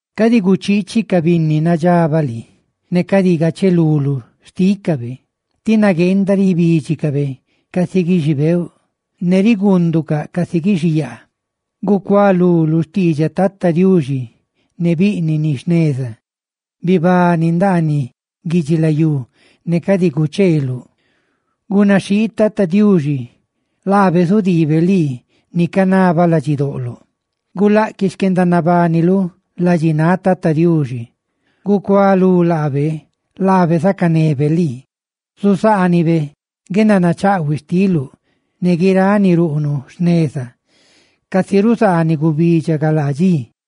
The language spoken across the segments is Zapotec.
Cadi guchiichi ca binni nadxabaꞌ lii, ne cadi gacheluluꞌ xtícabe, tí nagueenda ribídxicabe casi guixibeeuꞌa; ¡ne riguunducaꞌ casi guixiyaa! Gucualú lu xtiidxaꞌ Tata Diuxi ne biꞌniꞌ ni jneza, bibani ndaaniꞌ guidxilayú ne cadi gucheeluꞌ. Gunaxhii Tata Diuxi ne guendanayecheꞌ, laabe zudiibe lii ni canabaꞌ ladxidoꞌloꞌ. Gulaꞌquiꞌ xquendanabaniluꞌ ladxináꞌ Tata Diuxi; gucualú laabe, ne laabe zacanebe lii. Zuzaanibe guendanachaꞌhuiꞌ xtiluꞌ ne guiráꞌ ni ruꞌnuꞌ jneza casi ruzaaniꞌ gubidxa galaa dxi.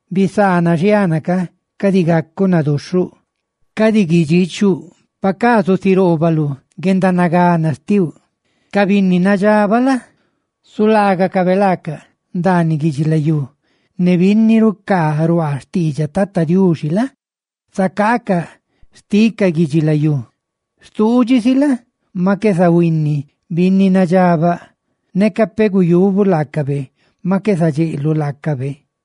Bisaana xiana ca, cadi gacuꞌ naduxhuꞌ; cadi guidxiichuꞌ, pacaa zusiroobaluꞌ guendanagana xtiuꞌ. Ca binni nadxabaꞌ la? zulaagacabe laacaꞌ ndaaniꞌ guidxilayú, ne binni rucaa ruaa xtiidxaꞌ Tata Dixi la? zaca xticaꞌ guidxilayú. Stuudxi si la? maꞌ qué zahuinni binni nadxabaꞌ; neca peꞌ guyubuꞌ laacabe, maꞌ qué zadxeꞌluꞌ laacabe.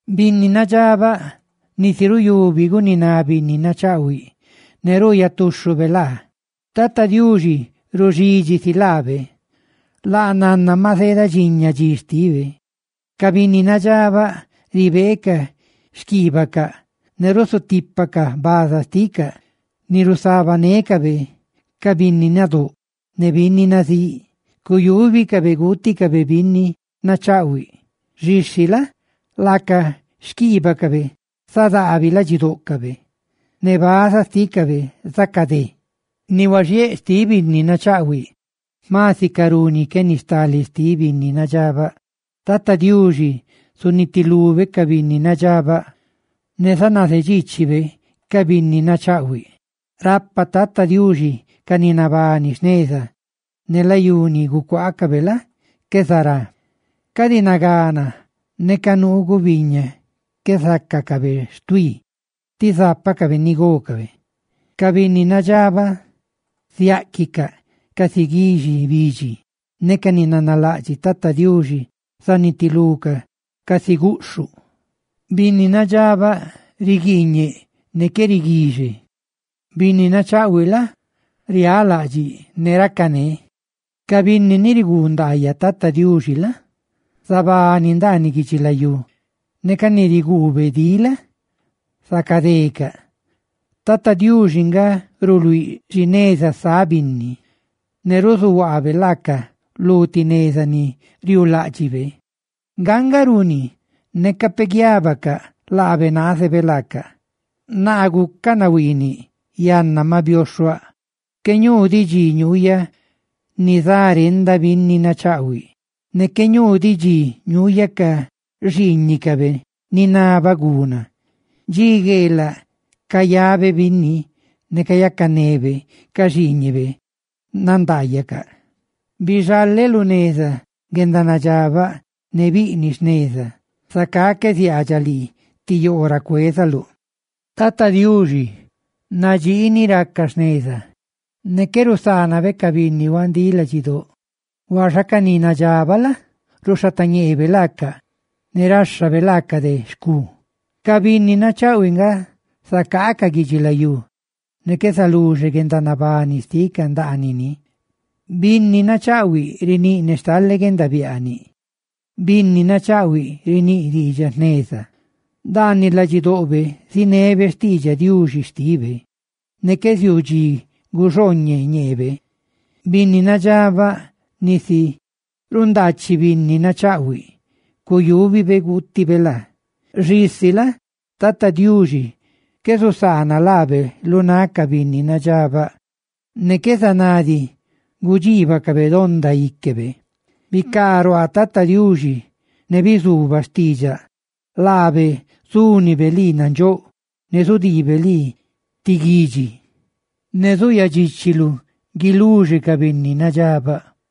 Binni nadxabaꞌ nisi ruyubi guniná binni nachaꞌhuiꞌ, ne ruuyaꞌ tuxhube laa. Tata Diuxi ruxidxi si laabe, laa nanna maꞌ zeedadxiña dxi xtibe. Ca binni nadxabaꞌ ribeecaꞌ xquiibacaꞌ ne rusutipacaꞌ baza xticaꞌ ni rusabanécabe ca binni nadóꞌ ne binni nazíꞌ, ¡cuyúbicabe guuticabe binni nachaꞌhuiꞌ! Xisi la? laca xquiibacabe zadaabi ladxidóꞌcabe, ne baza xtícabe zacadé. Ni huaxiéꞌ xtiꞌ binni nachaꞌhuiꞌ jma sicarú ni que ni stale xtiꞌ binni nadxabaꞌ. Tata Diuxi zunitilube ca binni nadxabaꞌ, ne zanazedxiichibe ca binni nachaꞌhuiꞌ. Rapa Tata Diuxi ca ni nabani jneza, ne layú ni gucuaacabe la? qué zará. Ca dxi nagana, neca nuu gubiña, qué zácacabe xtuí, tí zápacabe ni gócabe. Ca binni nadxabaꞌ ziáꞌquicaꞌ casi guixi bidxi; ca ni nanalaꞌdxiꞌ Tata Diuxi zanitilucaꞌ casi guꞌxhuꞌ. Binni nadxabaꞌ riguiiñeꞌ ne qué riguixe, binni nachaꞌhuiꞌ la? riálaꞌdxiꞌ ne racané. Ca binni ni riguu ndaayaꞌ Tata Diuxi la? zabani ndaaniꞌ guidxilayú, ne ca ni riguube dí la? zacadecaꞌ. Tata Diuxi nga ruluíꞌ xi neza sáꞌ binni, ne ruzuhuaabe laacaꞌ lu ti neza ni riuuláꞌdxibe. Nga nga runi neca peꞌ guiábacaꞌ, laabe naazebe nacaꞌ. Naa gucaꞌ nahuiiniꞌ, yanna maꞌ bioxhuaꞌ, qué ñuu diꞌ dxi ñuuyaꞌ nizarenda binni nachaꞌhuiꞌ, ne qué ñuu diꞌ dxi ñuuyaꞌ ca xiiñicabe ninabaꞌ guna. Dxi gueelaꞌ cayabe binni ne cayacanebe; ca xiiñibe nandaayacaꞌ. Bixaleꞌ lu xneza guendanadxabaꞌ ne biꞌniꞌ jneza, zacá qué ziaadxaꞌ lii ti yoo ra cuézaluꞌ. Tata Diuxi nadxii ni raca jneza, ne que rusaanabe ca binni huandíꞌ ladxidóꞌ; huaxa ca ni nadxabaꞌ la? ruxhatañeebe laacaꞌ, ne ráxhabe laacaꞌ de xcú. Ca binni nachaꞌhuiꞌ nga zacaacaꞌ guidxilayú, ne qué zaluxe guendanabani xticaꞌ ndaaniꞌ ni. Binni nachaꞌhuiꞌ riníꞌ ne stale guendabiaaniꞌ; binni nachaꞌhuiꞌ riníꞌ diidxaꞌ jneza. Ndaaniꞌ ladxidoꞌbe zinebe xtiidxaꞌ Diuxi xtibe; ¡ne qué ziuu dxi guxooñeꞌ ñeebe! Binni nadxabaꞌ nisi rundaachiꞌ binni nachaꞌhuiꞌ, cuyubibe guutibe laa; xisi la? Tata Diuxi qué zusaana laabe lu náꞌ ca binni nadxabaꞌ, ne qué zaná diꞌ gudxiibacabe donda íquebe. Bicaruaa Tata Diuxi ne bizubaꞌ xtiidxaꞌ, laabe zúnibe lii nandxóꞌ ne zudiibe lii ti guidxi. ¡Ne zuyadxiichiluꞌ guiluxe ca binni nadxabaꞌ!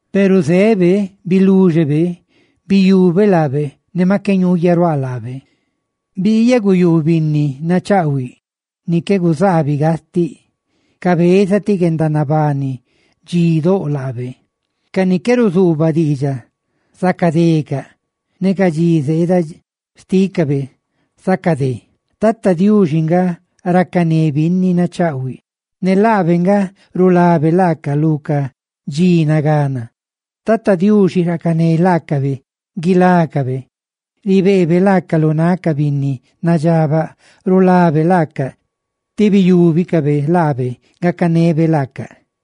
peru zeꞌ, biluxe guendanabani xtiꞌ; biyubeꞌ laabe ne maꞌ qué ñuuyaꞌruáꞌ laabe. Biiyaꞌ guꞌyuꞌ binni nachaꞌhuiꞌ ni qué guzaabiꞌ gastiꞌ: cabeza ti guendanabani dxidóꞌ laabe. Ca ni que ruzuubaꞌ diidxaꞌ zacadecaꞌ, ne ca dxi zeeda xtiꞌ ca binni nadxabaꞌ zacadé. Tata Diuxi nga racané binni nachaꞌhuiꞌ, ne laabe nga rulabe laaca lu ca dxi nagana. Tata Diuxi racané laacabe guilácabe. Ribeebe laacaꞌ lu náꞌ ca binni nadxabaꞌ, ne rulabe laacaꞌ, tí biyúbicabe laabe gacanebe laacaꞌ.